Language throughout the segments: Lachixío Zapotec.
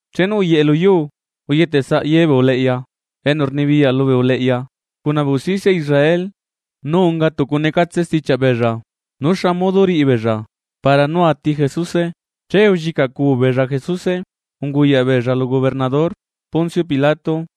Chenu uyeꞌe lu yuu, uyetesaꞌ ye bee uleꞌya enu rnibiyaꞌ lubee uleꞌya cuna bee usticia Israel nu unga tucu necatse stichiaꞌ beella nú xa modo riꞌi beella para nú ati Jesuse. Che ullicaꞌcu beella Jesuse unguyaꞌ beella lu gobernador Poncio Pilato.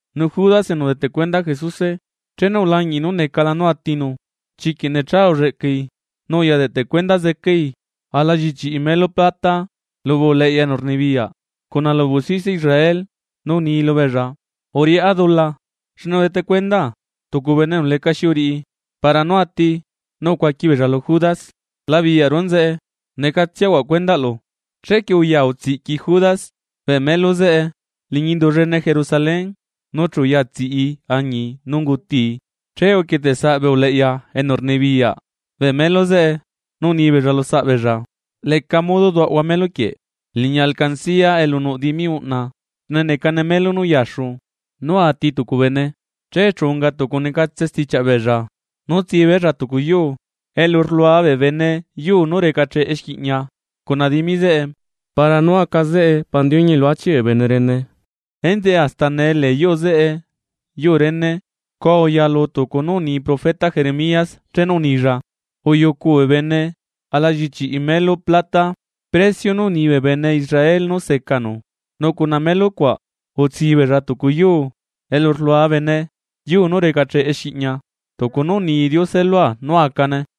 Nu Judas enu udeteꞌ cuenda Jesuse, chenu ulañiꞌi nú necala nú atinu chiquiꞌ necha ulleꞌcai, nu uya deꞌte cuenda zecai ala llichiꞌi melu plata lubee uleꞌya enu rnibiyaꞌ, cuna lubee usticia Israel, nu uni lubeella: ―Uriꞌá dula xne udete cuendaa tucu bene enu lecaxi uriꞌi para nú ati. Nu ucuaqui beella lu Judas: ―¿La biyaꞌru enzeꞌe? ¡Necatsiahuaꞌ cuendaꞌlu! Chequie uya utsiꞌqui Judas bee melu zeꞌe liñi indu llene Jerusalén, nu chu uya tsiꞌi añii nu ungutii. Che uquieteꞌsaꞌ bee uleꞌya enu rnibiyaꞌ bee melo zeꞌe, nu uni beella lusaꞌ beella: ―Leca modo duaꞌahua melu quieꞌ liñi alcancía elu nuꞌ dimi uꞌna, xne necane melo nú uyaxu nú ati tucu bene. Che chu unga tucu necatse stichiaꞌ beella nú tsi beella tucu yuu elu rlua bee bene yuu nú recacheꞌ exquiꞌñia cuna dimi zeꞌe, para nú aca zeꞌe pandiuñi elu achiꞌ bee bene rene. Enzeꞌe hasta nee lee yuu zeꞌe, yuu rene. Scua uyalu tucu nú uni profeta Jeremías chenu unilla: “Uyucu bee bene ala llichiꞌi melo plata (precio nú uni bee bene Israel nú secanu), nu cuna melo cuaꞌ utsi beella tucu yuu elu rlua bene yuu nú recacheꞌe exquiꞌñia, tucu nú uni Diose lua nú acane.”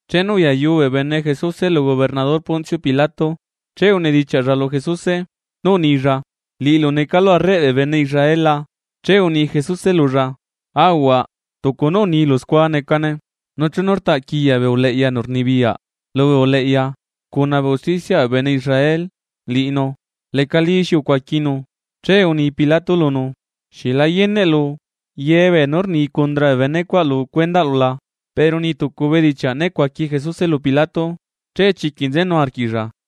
Chenu uyayu bee bene Jesuse lu gobernador Poncio Pilato, che unedichiaꞌlla lu Jesuse, nú unilla: ―¿Liꞌilu necalu arreꞌ bee bene Israel la? Che uni Jesuse lulla: ―Ahuaꞌ, tucu nú unilu scua necane. Nu chenu rtaꞌquiya bee uleꞌya enu rnibiyaꞌ lubee uleꞌya cuna bee usticiaꞌ bee bene Israel liꞌinu, lecalí xi ucuaquinu. Che uni Pilato lunu: ―¿Xieꞌ la yeneꞌlu ye beenú rni cundra bee benecuaꞌ lu cuendaꞌlu la? Pero niꞌ tucu bedichiaꞌ né cuaqui Jesuse lu pilato, che chiquiꞌ nzenu arquiꞌlla.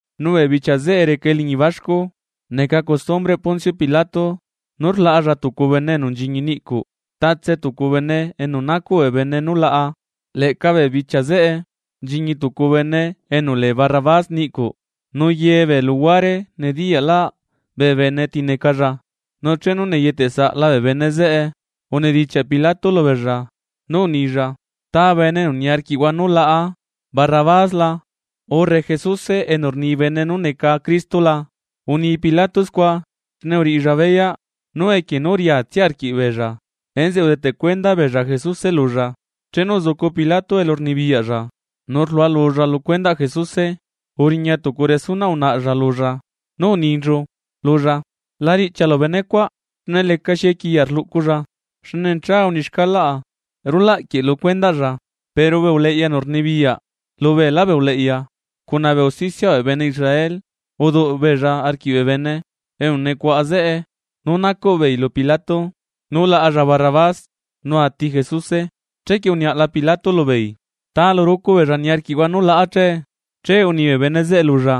Nu bee bichia zeꞌe reca eliñi baxcu neca costumbreꞌ Poncio Pilato nú rlaꞌalla tucu bene enu nchiñi niꞌcuꞌ, tatse tucu bene enu nacuꞌ bee bene nu laꞌa. Leꞌca bee bichia zeꞌe nchiñi tucu bene enu lee Barrabás niꞌcuꞌ, nu ye bee luhuare nediyaꞌlaꞌ bee bene ti necalla. Nu chenu neyeteꞌsaꞌla bee bene zeꞌe, unedichiaꞌ Pilato lubeella nú unilla: ―¿Ta bene enu niarquiꞌhua nú laꞌa: Barrabás la?, urre ¿Jesuse enu rni bee bene nú neca Cristo la? Uni Pilato scua xne uriꞌilla beyaꞌ nú equie nú riatsia arquiꞌbeella enzeꞌe udeteꞌ cuenda beella Jesuse lulla. Chenu uzucu Pilato elu rnibiyaꞌlla nu rlualulla lu cuendaꞌ Jesuse, uriña tucu resunaꞌ unaꞌalla lulla nú uninchu lulla: “La riꞌchialu benecuaꞌ xne lecaxi equiya rluꞌculla, xne necha uni xcalaꞌa rulaꞌ quieꞌ lu cuendaꞌlla.” Pero bee uleꞌya enu rnibiyaꞌ lubeelá bee uleꞌya cuna bee usticiaꞌ bee bene Israel uduꞌ beella arquiꞌ bee bene enu nucuaꞌa zeꞌe nú nacuꞌ beei lu Pilato nú laꞌalla Barrabás, nu ati Jesuse. Chequie uniaꞌla Pilato lubeei: ―¿Ta lu rucu beella niarquiꞌhua nú laꞌa che? Che uni bee bene zeꞌe lulla: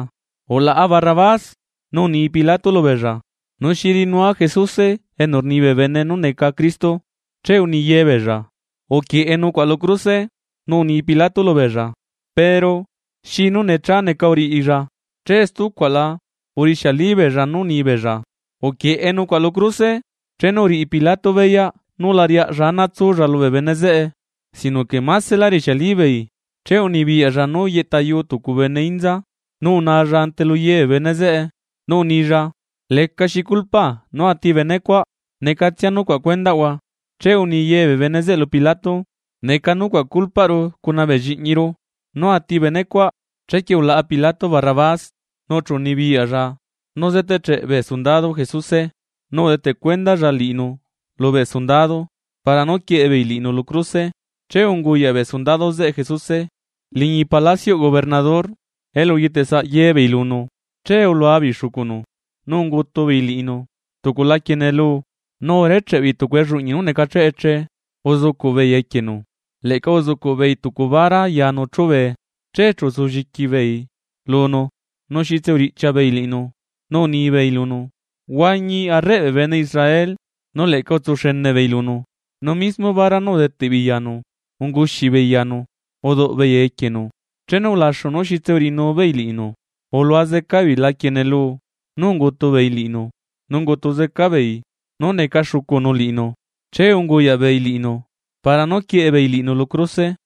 ―Ulaꞌa Barrabás. Nu uni Pilato lubeella: ―¿Nu xi riꞌinua Jesuse enu rni bee bene nú neca Cristo? Che uni ye beella: ―¡Uquieꞌe nucuaꞌ lu cruse! Nu uni Pilato lubeella: ―Pero ¿xi nú necha neca uriꞌilla? Che stucuaꞌla urixialibeella nú uni beella: ―¡Uquieꞌe nucuaꞌ lu cruse! Chenu uriꞌi Pilato beyaꞌ nú lariaꞌlla ana tsulla lubee bene zeꞌe sino que maselá rixialibeei, che unibiyaꞌlla nú yeꞌtayu tucu bene inza, nu unalla ante lu ye bee bene zeꞌe, nú unilla: ―Lecaxi culpaa nú ati bene cuaꞌ, necatsia nucuaꞌ cuendaꞌhua. Che uni ye bee bene zeꞌe lu Pilato: ―¡Neca nucuaꞌ culpaꞌru cuna bee lliꞌñiru, nú ati benecuaꞌ! Chequie ulaꞌa Pilato Barrabás, nu chu unibiyaꞌlla nú zeteꞌcheꞌ bee sundado Jesuse, nu udeteꞌ cuendalla liꞌinu lubee sundado para nú quieꞌe beei liꞌinu lu cruse. Che unguyaꞌ bee sundado zeꞌe Jesuse liñi palacioꞌ gobernador, elu uyetesaꞌ ye beei lunu. Che ulua beei xucunu, nu ungutu beei liꞌinu tucu laquie neluu, nu urecheꞌe beei tucu elluꞌñi nú necacheꞌ eche uzucuꞌ beei equienu, leꞌca uzucuꞌ beei tucu bara yanu chube. Che chu utsulliqui beei lunu nu xitse uriꞌchia beei liꞌinu nú unibeei lunu: ―¡Huañi arreꞌ bee bene Israel! Nu leꞌca utsuxene beei lunu, nu mismo bara nú udeteꞌ beei yanu unguxi beei yanu uduꞌbeei equienu. Chenu ulaxu nú xitse uriꞌinu beei liꞌinu, ulua zeca beei laquie neluu nú ungutu beei liꞌinu, nu ungutu zeca beei nú necaca xucunu liꞌinu. Che unguyaꞌ beei liꞌinu para nú quieꞌe beei liꞌinu lu cruse.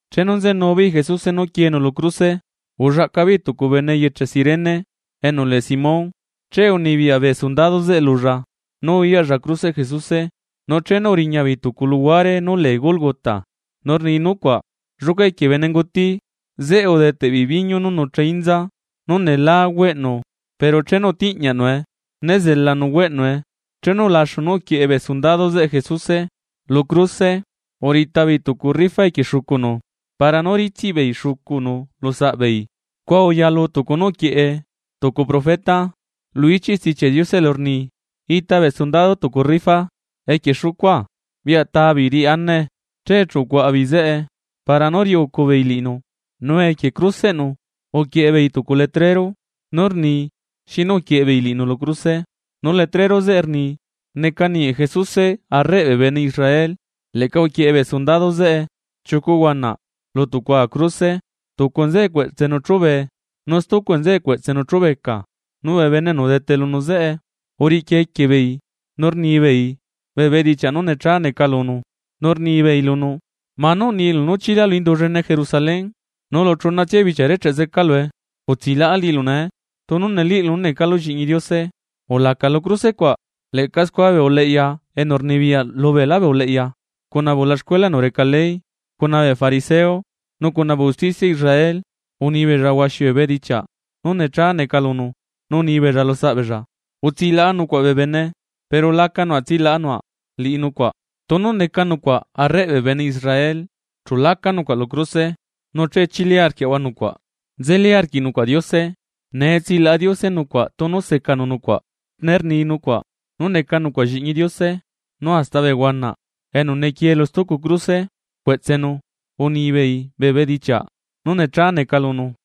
Chenu nzenu beei Jesuse nú quienu lu cruse ullaꞌca beei tucu bene eyeche Cirene, enu lee Simón, che unibiyaꞌ bee sundado zeꞌe lulla nú uyaꞌlla cruseꞌ Jesuse. Nu chenu uriña beei tucu luhuare nú lee Gólgota, nu rni nucuaꞌ Lluca equie bene nguti. Zeꞌe udeteꞌ beei biñu nú nucha inza nú nelá güeꞌnu, pero chenu utiꞌñiaꞌnue, né zelanu agüeꞌnue. Chenu ulaxu nú uquieꞌe bee sundado zeꞌe Jesuse lu cruse, urita beei tucu rifa equie xucunu para nú ritsiꞌbeei xucunu lu saꞌbeei. Scua uyalu tucu nú uquieꞌe tucu profeta lu ichiꞌ Stichiaꞌ Diose elu rni: “Ita bee sundado tucu rifa equie xucua biꞌya ta beei riꞌi anae.” Che chu ucuaꞌa beei zeꞌe para nú riꞌiucu beei liꞌinu. Nu equie cruseꞌnu uquieꞌe beei tucu letrero nú rni xinu uquieꞌe beei liꞌinu lu cruse. Nu letrero zeꞌe rni: “Neca ninguieꞌ Jesuse arreꞌ bee bene Israel.” Leꞌca uquieꞌe bee sundado zeꞌe chiucu huanaꞌ lu tucua cruse, tucu nzeꞌe cueꞌtsenu chube nu stucu nzeꞌe cueꞌtsenu chubeca. Nu bee bene enu udete lunu zeꞌe, uriꞌqui equie beei nu rnibeei bee bedichiaꞌ nú necha neca lunu, nu rnibeei lunu: ―Manú unilu nú chilalu indu llene Jerusalén nulu chunatsia bichia recheꞌ zecalue, utsilaꞌa liꞌilu nee. Tunu neliꞌilu nú necalu lliꞌñi Diose, ulaca lu cruse cuaꞌ. Leꞌca scua bee uleꞌya enu rnibiyaꞌ lubeelá bee uleꞌya cuna bee ulaxcuela enu reca ley, cuna bee fariseo nu cuna bee usticia Israel, uni beella huaxi bee bedichiaꞌ nú necha neca lunu, nu unibeella lusaꞌbeella: ―Utsilaꞌa nucuaꞌ bee bene, pero laca nucuaꞌ tsilaꞌa nucuaꞌ liꞌi nucuaꞌ. Tunu neca nucuaꞌ arreꞌ bee bene Israel, chu laca nucuaꞌ lu cruse nu che chili arquiaꞌahua nucuaꞌ. Nzelí arquiꞌ nucuaꞌ Diose, nee tsilaꞌa Diose nucuaꞌ tunu secanu nucuaꞌ, xne rni nucuaꞌ nú neca nucuaꞌ lliꞌñi Diose. Nu hasta bee huanaꞌ enu nequie lu stucu cruse cueꞌtsenu unibeei bee bedichiaꞌ nú necha neca lunu.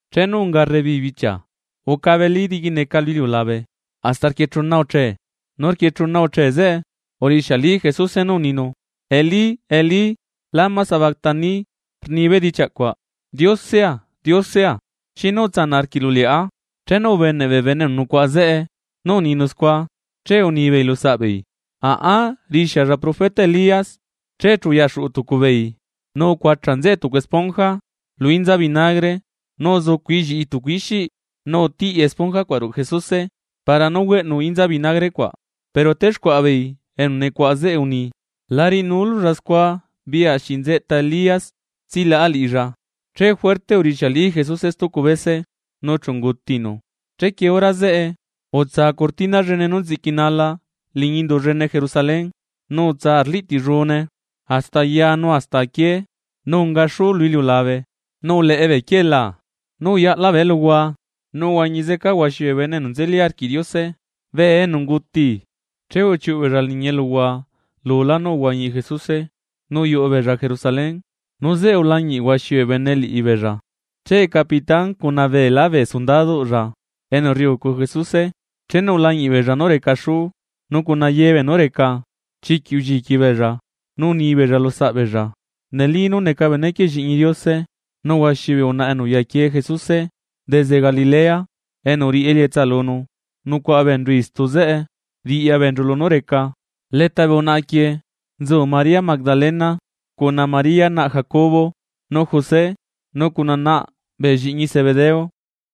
Chenu unga rrebichia ucabelí diquineca lu iliulabe, hasta rquie chuna uche. Nu rquie chuna uche zeꞌe, urixiali Jesuse nu uninu: ―Elí, Elí, ¿lama sabactani?, rni bedichiaꞌ cuaꞌ: Diosea, Diosea, ¿xinu utsanaꞌ arquiꞌlu liꞌá? Chenu ubeneꞌ bee bene enu nucuaꞌa zeꞌe nú uninu scua, che unibeei lusaꞌbeei: ―Aꞌa rixialla profeta Elías. Che chu uyaxuꞌu tucu beei nu ucuacha nzeꞌe tucu esponja lu inza vinagre, nu uzucuꞌi lliꞌi tucu ixiꞌ, nu utiꞌi esponja cuaꞌ ruꞌu Jesuse para nú güeꞌnu inza vinagre cuaꞌ. Pero texcuaꞌa beei enu nucuaꞌa zeꞌe uni: ―La riꞌinululla scua biꞌya se nzeꞌta Elías tsilaꞌa liꞌilla. Che juerte urixiali Jesuse stucu bese, nu chu ungutinu. Chequie hora zeꞌe utsa cortina llene nú nziꞌquinala liñi indu llene Jerusalén, nu utsa arliꞌtillune hasta aya nu hasta aquié. Nu unga xuú lu iliulabe nu uleꞌe bee quielaa, nu uyaꞌla bee eluhua nu uhuañi zeca huaxi bee bene enu nzeli arquiꞌ Diose, bee enu unguti. Che uchiuꞌu beella liñi eluhua lulá nú uhuañi Jesuse, nu uyuꞌu beella Jerusalén. Nu zeꞌe ulañiꞌ huaxi bee bene liꞌibeella. Che capitán cuna beelá bee sundaduꞌlla enu rriucu Jesuse, chenu ulañiꞌ beella nú reca xú nu cuna ye beenú reca, chiquiꞌ ulliqui beella nu unibeella lusaꞌ beella: ―¡Neli nú neca benequieꞌ Lliꞌñi Diose! Nu huaxi bee unaꞌa enu uyaquie Jesuse desde Galilea enu uriꞌi elietsa lunu nucuaꞌa beenchu istu zeꞌe riꞌya beenchu lunú reca. Leta bee unaꞌa quieꞌ nzu María Magdalena, cuna María naꞌ Jacobo nu José, nu cuna naꞌ bee llianaꞌ Zebedeo.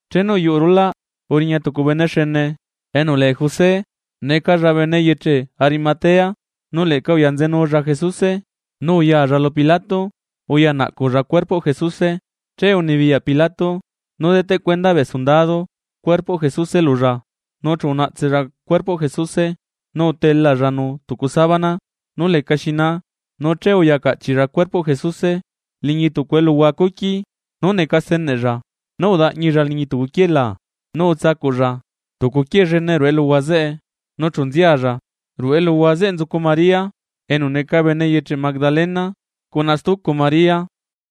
Chenu uyuꞌu rulaꞌ, uriña tucu bene xene enu lee José, necalla bene eyeche Arimatea, nu leꞌca uyanzenulla Jesuse. Nu uyalla lu Pilato uyanaꞌculla cuerpoꞌ Jesuse. Che unibiyaꞌ Pilato nú deteꞌ cuenda bee sundado cuerpoꞌ Jesuse lulla, nu chu unaꞌtsella cuerpoꞌ Jesuse nu utelallanu tucu sábana nú lecaxi naa nu che uya caꞌchiꞌlla cuerpoꞌ Jesuse liñi tucu eluhua cuqui nú neca steneꞌlla, nú udaꞌñilla liñi tucu quielaa, nu utsacuꞌlla tucu quiee llene ruꞌu eluhua zeꞌe nu chu nzialla. Ruꞌu eluhua zeꞌe nzucu María enu neca bene eyeche Magdalena cuna stucu María.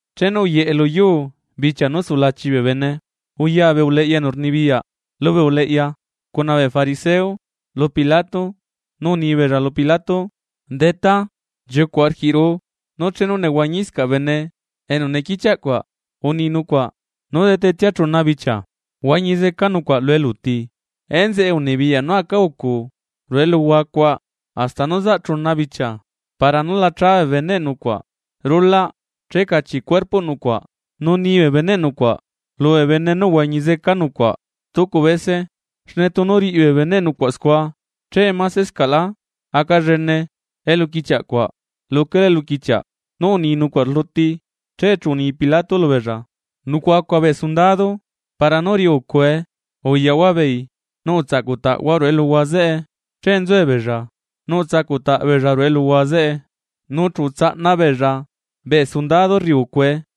Chenu uyeꞌe lu yuu bichia nú sulachi bee bene uya bee uleꞌya enu rnibiyaꞌ lubee uleꞌya cuna bee fariseo lu Pilato, nu uni beella lu Pilato: ―Detá, nchiucuꞌ arquiꞌru nú chenu nehuañiscaꞌ bene enu nequichiaꞌ cuaꞌ, uni nucuaꞌ nú detetsia chuna bichia huañizeca nucuaꞌ lu eluti. Enzeꞌe unibiyaꞌ nú aca ucu ruꞌu eluhua cuaꞌ hasta nú zaꞌ chuna bichia para nú la cha bee beneꞌ nucuaꞌ rulaꞌ che cachiꞌ cuerpoꞌ nucuaꞌ, nu ni bee beneꞌ nucuaꞌ lubee bene nú uhuañi zeca nucuaꞌ stucu bese. Xne tunu riꞌi bee beneꞌ nucuaꞌ scua che masescaꞌlá aca llene eluquichiaꞌ cuaꞌ luquelá eluquichiaꞌ nú uni nucuaꞌ rluti. Che chu uni Pilato lubeella: ―Nucuaꞌacua bee sundado. Para nú riꞌi ucue. Uyaꞌhua beei nu utsaꞌcutaꞌhua ruꞌu eluhua zeꞌe. Che nzuebeella, nu utsacuꞌtaꞌ beella ruꞌu eluhua zeꞌe, nu chu utsaꞌna beella bee sundado rriucue.